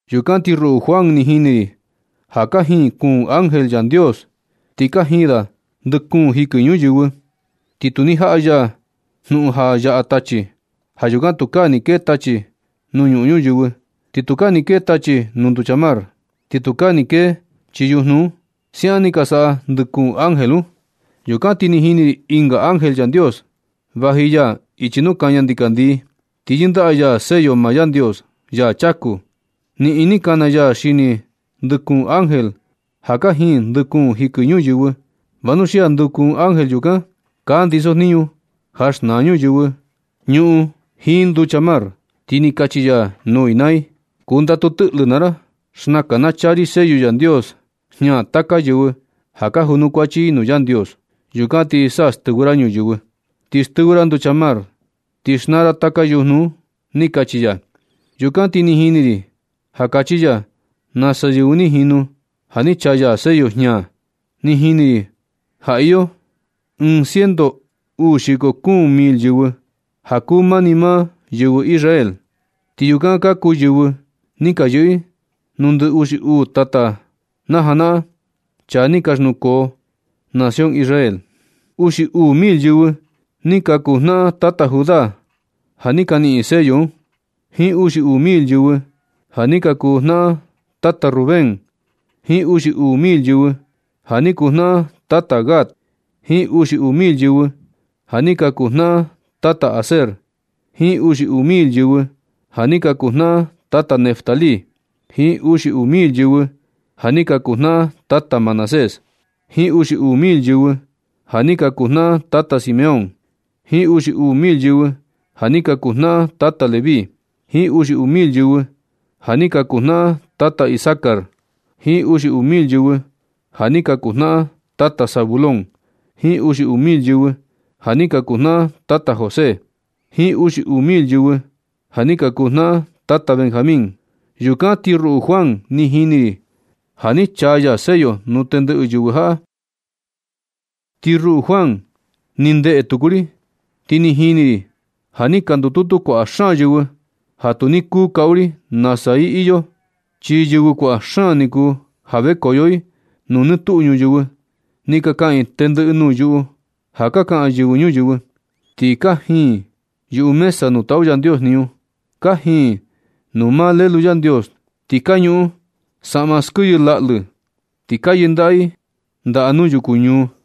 Yukan ti ruꞌu Juan, ni jini ri ja kajin kuun ángel Yandios. Ti kajin da ndɨ kuun jikɨ ñuyɨvɨ. Ti tu ni jaꞌa ya jnuꞌun ja yaꞌa tachi. Ja yukan tukaa ni kee tachi nuu ñuꞌun ñuyɨvɨ. Ni tukaa ni kee tachi nuu nducha mar. Ni tukaa ni kee chii yujnu un. Siaꞌan ni ka saꞌa ndɨ kuun ángel un. Yukan ti ni jini ri ɨnga ángel Yandios. Vaji ya ichi nuu kaña ndikandii. Ti yɨndaꞌa ya sello maa Yandios, ya chaku. Niꞌin ni kana ya xini ndɨ kuun ángel ja kajin ndɨ kuun jikɨ ñuyɨvɨ. Vanuxia ndɨ kuun ángel yukan ka ndisojniñu ja xnaa ñuyɨvɨ, ñuꞌun jiin nducha mar. Ti ni kachi ya nuu i naa i: ―Kundatu tɨꞌlɨ naa ra. Xnakan na chaa ri sello Yandios jña taka yɨvɨ ja ka junukuachi i nuu Yandios, yukan na ti sa stɨvɨ ra ñuyɨvɨ. Ti stɨvɨ ra nducha mar. Ti xnaa ra taka yujnu un ―ni kachi ya. Yukan ti ni jini ri ja kachi ya nasa yɨvɨ ni jinu ja ni chaa ya sello jña. Ni jini ri ja iyo ciento uu xiko kuun mil yɨvɨ, ja kuu maa ni maa yɨvɨ Israel. Ti yukan ka kuu yɨvɨ ni ka yɨꞌɨ nuu ndɨ uxi uu tata najanaꞌan, chaa ni ka xnukoo nación Israel. Uxi uu mil yɨvɨ ni ka kuu jnaꞌan tata Judá ja ni ka niꞌin sello un, jiin uxi uu mil yɨvɨ ja ni ka kuu jnaꞌan tata Rubén, jiin uxi uu mil yɨvɨ ja ni kuu jnaꞌan tata Gad, jiin uxi uu mil yɨvɨ ja ni ka kuu jnaꞌan tata Aser, jiin uxi uu mil yɨvɨ ja ni ka kuu jnaꞌan tata Neftalí, jiin uxi uu mil yɨvɨ ni ka kuu jnaꞌan tata Manasés, jiin uxi uu mil yɨvɨ ja ni ka kuu jnaꞌan tata Simeón, jiin uxi uu mil yɨvɨ ja ni ka kuu jnaꞌan tata Leví, jiin uxi uu mil yɨvɨ ja ni ka kuu jnaꞌan tata Isakar, jiin uxi uu mil yɨvɨ ja ni ka kuu jnaꞌan tata Zabulón, jiin uxi uu mil yɨvɨ ja ni ka kuu jnaꞌan tata José, jiin uxi uu mil yɨvɨ ja ni ka kuu jnaꞌan tata Benjamín. Yukan ti ruꞌu Juan ni jini ri ja ni chaa ya sello nuu tendɨꞌɨ yɨvɨ jaꞌa. Ti ruꞌu Juan ni ndeꞌe tuku ri, ti ni jini ri ja ni ka ndututu kuaꞌa xaan yɨvɨ, ja tu ni kuu kaꞌu ri nasa i ni iyo, chi yɨvɨ kuaꞌa xaan ni kuu, ja vekoyo i nuu nɨ tuꞌu ñuyɨvɨ. Ti ka kaꞌan i tendɨꞌɨ nuu yuꞌu ja ka kaꞌan yɨvɨ ñuyɨvɨ. Ti kajin i yuꞌu mesa nuu taꞌu Yandios jniñu. Kajin i nuu maa Lelu Yandios. Ti ka ñuꞌun saꞌma skiyɨ laꞌlɨ, ti ka yɨndaꞌa i ndaꞌa nuu yukuñuu.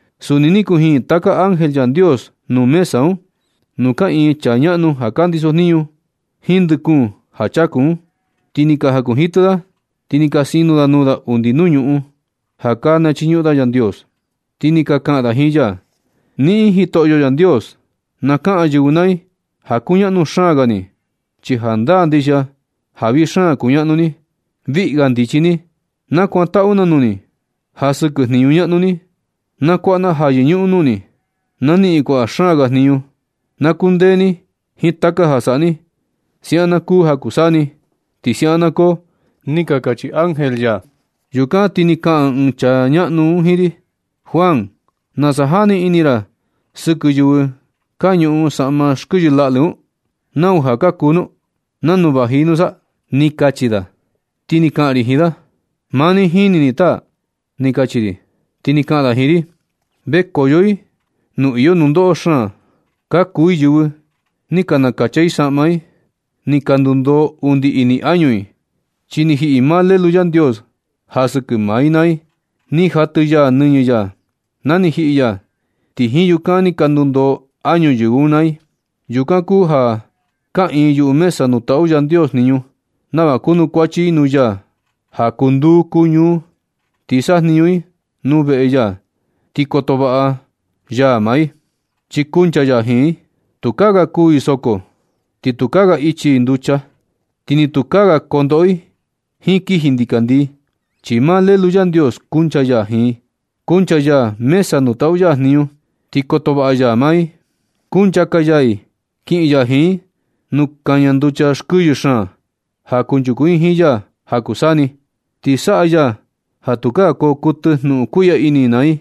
Suni ni kujin taka ángel Yandios nuu mesa un, nuu kaꞌiin chaa ñaꞌnu ja ka ndisojniñu, jiin ndɨ kuun ja chaku un. Ti ni ka jakunjitɨ da, ti ni ka sino da nuu da undi nuu ñuꞌun, ja ka chiñuꞌun da Yandios. Ti ni ka kaꞌan da jiin ya: ¡Niꞌin, Jitoꞌo Yandios! Na kaꞌan yɨvɨ naa i ja kuñaꞌnu xaan ga ni, chi jandaa ndixia ja vii xaan kuñaꞌnu ni. Viꞌi ga ndichi ni. Na kakantaꞌu na nuu ni. Ja sɨkɨ jniñu ñaꞌnu ni, na kuaꞌa na ja yɨñuꞌun nuu ni. Na niꞌin kuaꞌa xaan ga jniñu. Na kundee ni jiin taka ja saꞌa ni. Siaꞌan na kuu ja kuu saa ni, ti siaꞌan na koo. Ni ka kachi ángel ya. Yukan ti ni kaꞌan ɨɨn chaa ñaꞌnu un jiin ri: ―Juan, ¿Nasa jani ini ra sɨkɨ yɨvɨ ka ñuꞌun saꞌma xkɨyɨ laꞌlɨ un? ¿Nau ja ka kuu nu? ¿Nanu vaji i nusa? ―ni kachi da. Ti ni kaꞌan ri jiin da: ―Maa ni jini ni, taa ―ni kachi ri. Ti ni kaꞌan da jiin ri: ―Vekoyo i nuu iyo nundoꞌo xaan. Ka kuu i yɨvɨ ja ni ka nakacha i saꞌma i. Ni ka ndundoo undi ini añu i, chi ni jiꞌi maa Lelu Yandios ja sɨkɨ maa i naa i. Ni jatɨ ya nɨñɨ ya na ni jiꞌi ya. Ti jiin yukan ni ka ndundoo añu yɨvɨ un naa i. Yukan kuu ja kaꞌiin yuꞌu mesa nuu taꞌu Yandios jniñu, nava kunukuachi i nuu ya ja kuu nduu kuu ñuu. Ti sajniñu i nuu veꞌe ya, ti koto vaꞌa ya maa i chi kuncha ya jiin i. Tukaa ga kuu i soko, ni tukaa ga ichi i nducha, ti ni tukaa ga kondoꞌo i jiin kiji ndikandii. Chi maa Lelu Yandios kuncha ya jiin, kuncha ya mesa nuu taꞌu ya jniñu, ti koto vaꞌa ya i. Kunchaka ya i kiꞌin ya jiin i nuu kaña nducha skɨyɨ xaan ja kunchuku i jiin ya ja kuu saa ni. Ti saꞌa ya ja tukaa koo kuɨtɨ jnuꞌun kuiꞌya ini i naa i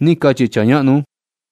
―ni kachi chaa ñaꞌnu un.